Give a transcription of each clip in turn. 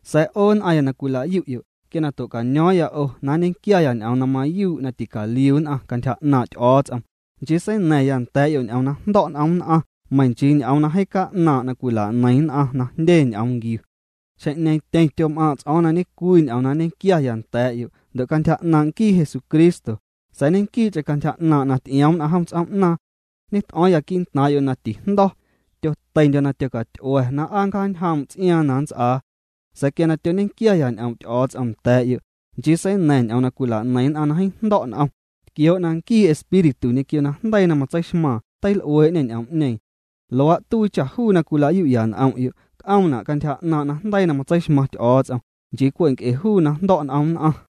Sa̱a̱ 'o nn'aⁿya na cwila'yu'yo', quia tua̱caño̱o̱ⁿya 'o na nñequiaya ñ'oom na mayuu' na ticaliu nn'aⁿ cantyja 'naaⁿ' Ty'o̱o̱ts'om, nchii seina̱ⁿya nda̱a̱'yo' ñ'oom na jndo̱' n'om nn'aⁿ meiⁿ nchii ñ'oom na jeeⁿ ca'naaⁿ' na cwila'neiⁿ nn'aⁿ na jndye ñ'oom nquiu. Xjeⁿ'ñeeⁿ tyeⁿ tyom'aaⁿ' ts'o̱o̱ⁿ na ñe'cwii ñ'oom na nñequiaya nda̱a̱'yo', ndo' cantyja 'naaⁿ' nquii Jesucristo, sa̱a̱ ñequii'cheⁿ cantyja 'naaⁿ' na ty'ioom nn'aⁿ jom ts'oom'naaⁿ. Ñet'o̱o̱ⁿya quii'ntaaⁿ'yo' na tijndo̱, tyoteindyo̱ na tyocat'ua̱ na aa nncjaacañjoom' ts'iaaⁿ na nnts'aa. Sa̱a̱ quia tyoñequiaya ñ'oom' Ty'o̱o̱ts'om nda̱a̱'yo', nchii seina̱ⁿ ñ'oom na cwila'neiⁿ nn'aⁿ na jeeⁿ jndo̱' n'om, tquioo' na nquii Espíritu ñequio najndeii na matseixmaaⁿ teil'uee'ñê ñ'oom'ñeeⁿ. Luaa' tuii cha juu na cwila'yu'ya n'om'yo' c'oomna' cantyja 'naaⁿ' najndeii na matseixmaⁿ Ty'o̱o̱ts'om, nchii cwe' nc'e juu na jndo̱' n'om nn'aⁿ.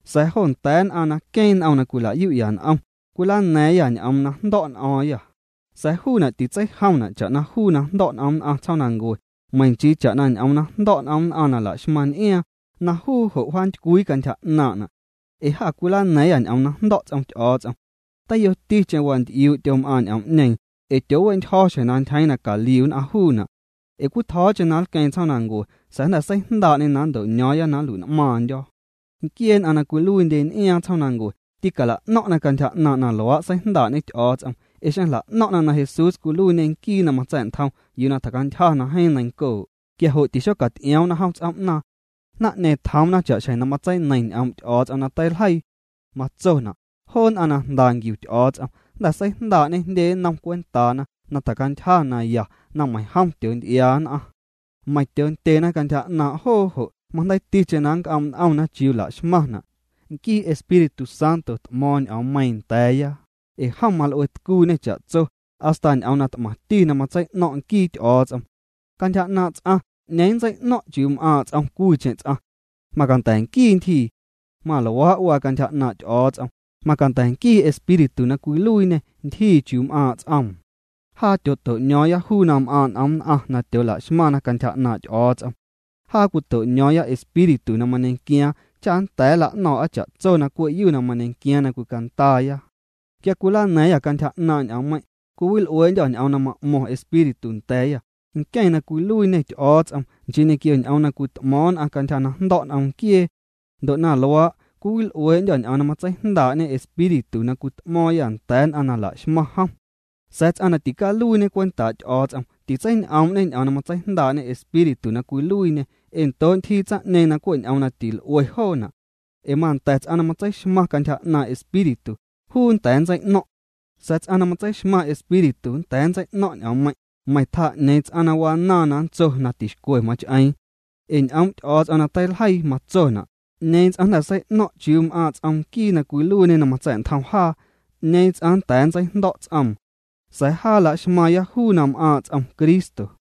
Sa̱a̱ jo nda̱a̱ nn'aⁿ na queeⁿ n'om na cwila'yu'ya n'om, cwilana̱a̱ⁿyâ ñ'oom na jndo̱ n'o̱o̱ⁿyâ, sa̱a̱ juuna' titseijomna' cha'na juu na jndo̱' n'om nn'aⁿ tsjoomnancue, meiⁿ nchii cha'na ñ'oom na jndo̱' n'om nn'aⁿ na la'xmaⁿ n'iaaⁿ, na juu jo' wjaantycwii cantyja 'naaⁿna. Ee jâ cwilana̱a̱ⁿyâ ñ'oom na jndo̱' ts'om Ty'o̱o̱ts'om. Teiyoticheⁿ wanty'iuu' tyom'aaⁿ ñ'oom'ñeeⁿ ee tyoowe'ntyjo̱ xjeⁿ na ntyjeeⁿ na caliu nn'aⁿ juuna'. Ee cwitjo̱o̱cheⁿ na nlqueeⁿ tsjoomnancue sa̱a̱ jnda̱ seijndaa'ñê na nnto'ño̱o̱ⁿya na nlui'n'maaⁿndyo̱. Nquiee nn'aⁿ na cwiluiindye n'iaaⁿ tsjoomnancue tîcala'no̱ⁿ'na cantyja 'naaⁿ' na luaa' seijndaa'ñe Ty'o̱o̱ts'om. Ee xeⁿ jla'no̱ⁿ'na na Jesús cwiluiiñê nquii na matsa̱'ntjom yuu na tjacantyja na jeeⁿ neiⁿncoo', quia jo' tîxocaty'ioomna jom ts'oom'naaⁿ. Naⁿ'ñeeⁿ tjoomna cha'xjeⁿ na matseineiⁿ ñ'oom' Ty'o̱o̱ts'om na teiljeii. Matsona': Joo nn'aⁿ na jnda nquiu Ty'o̱o̱ts'om, jnda̱ seijndaa'ñê jndye nnom cwentaana na tjacantyja na ya na meiⁿjom tyoonty'iaa nn'aⁿ. Meiⁿ tyoondyena cantyja 'naaⁿ joo jo', majndeiiticheⁿ na nnc'oom' n'omna chiuu la'xmaⁿna'. Nquii Espíritu Santo t'mo̱o̱ⁿ ñ'oommeiiⁿ nda̱a̱ya, ee jom mal'uetcuuñê cha'tso, hasta ñ'oom na t'maⁿti na matsei'no̱ⁿ' nquii Ty'o̱o̱ts'om. Cantyja 'naaⁿ' ts'aⁿ, ¿'ñeeⁿ nntsei'no̱ⁿ' chiuu m'aaⁿ' ts'om cwiicheⁿ ts'aⁿ? Macanda̱ nquii ntyjii. Maluaa' waa cantyja 'naaⁿ' Ty'o̱o̱ts'om, macanda̱ nquii Espíritu na cwiluiiñê ntyjii chiuu m'aaⁿ' ts'oom. Jaa tyooto'ño̱o̱ⁿya juu na m'aaⁿ' n'om nn'aⁿ na tyoola'xmaⁿna cantyja 'naaⁿ' Ty'o̱o̱ts'om. Jaa cwito'ño̱o̱ⁿya Espíritu na mañequiaaⁿ cha nnda̱a̱ nla'no̱o̱ⁿ'a cha'tso na cwe'yu na mañequiaaⁿ na cwicandaaya. Quia cwilana̱a̱ⁿyâ cantyja 'naaⁿ' ñ'oommeiⁿ', cwiwil'uee'ndyô̱ ñ'oom na ma'mo̱ⁿ Espíritu nda̱a̱yâ, nqueⁿ na cwiluiiñê Ty'o̱o̱ts'om, nchii ñequio ñ'oom na cwit'mo̱o̱ⁿ nn'aⁿ cantyja na jndo̱' n'om nquiee. Ndo' na luaa', cwiwil'uee'ndyô̱ ñ'oom na matseijndaa'ñe Espíritu na cwit'mo̱o̱ⁿyâ nda̱a̱ nn'aⁿ na la'xmaⁿna jom. Sa̱a̱ ts'aⁿ na ticaluiiñe cwentaa' Ty'o̱o̱ts'om titseiñ'oom'ñe ñ'oom na matseijndaa'ñe Espíritu na cwiluiiñê ee ndoo' ntyjii tsaⁿ'ñeeⁿ na cwe' ñ'oom na til'ue joona'. Ee manda̱ ts'aⁿ na matseixmaⁿ cantyja 'naaⁿ' Espíritu, juu nnda̱a̱ nntsei'no̱ⁿ'. Sa̱a̱ ts'aⁿ na matseixmaⁿ Espíritu nnda̱a̱ nntsei'no̱ⁿ' ñ'oommeiⁿ', meiⁿ tjaa 'ñeeⁿ ts'aⁿ na wanaaⁿ na nntso na tixcwe mach'eeⁿ. Ee ñ'oom' Ty'o̱o̱ts'om na teiljeii matsona': “¿'Ñeeⁿ ts'aⁿ jnda̱ sei'no̱ⁿ' chiuu na m'aaⁿ' ts'om Nquii na cwiluiiñe na matsa̱'ntjom jaa? ¿'Ñeeⁿ ts'aⁿ nnda̱a̱ nntseijndo̱' ts'oom?” Sa̱a̱ jaa laxmaaⁿya juu na m'aaⁿ' ts'om Cristo.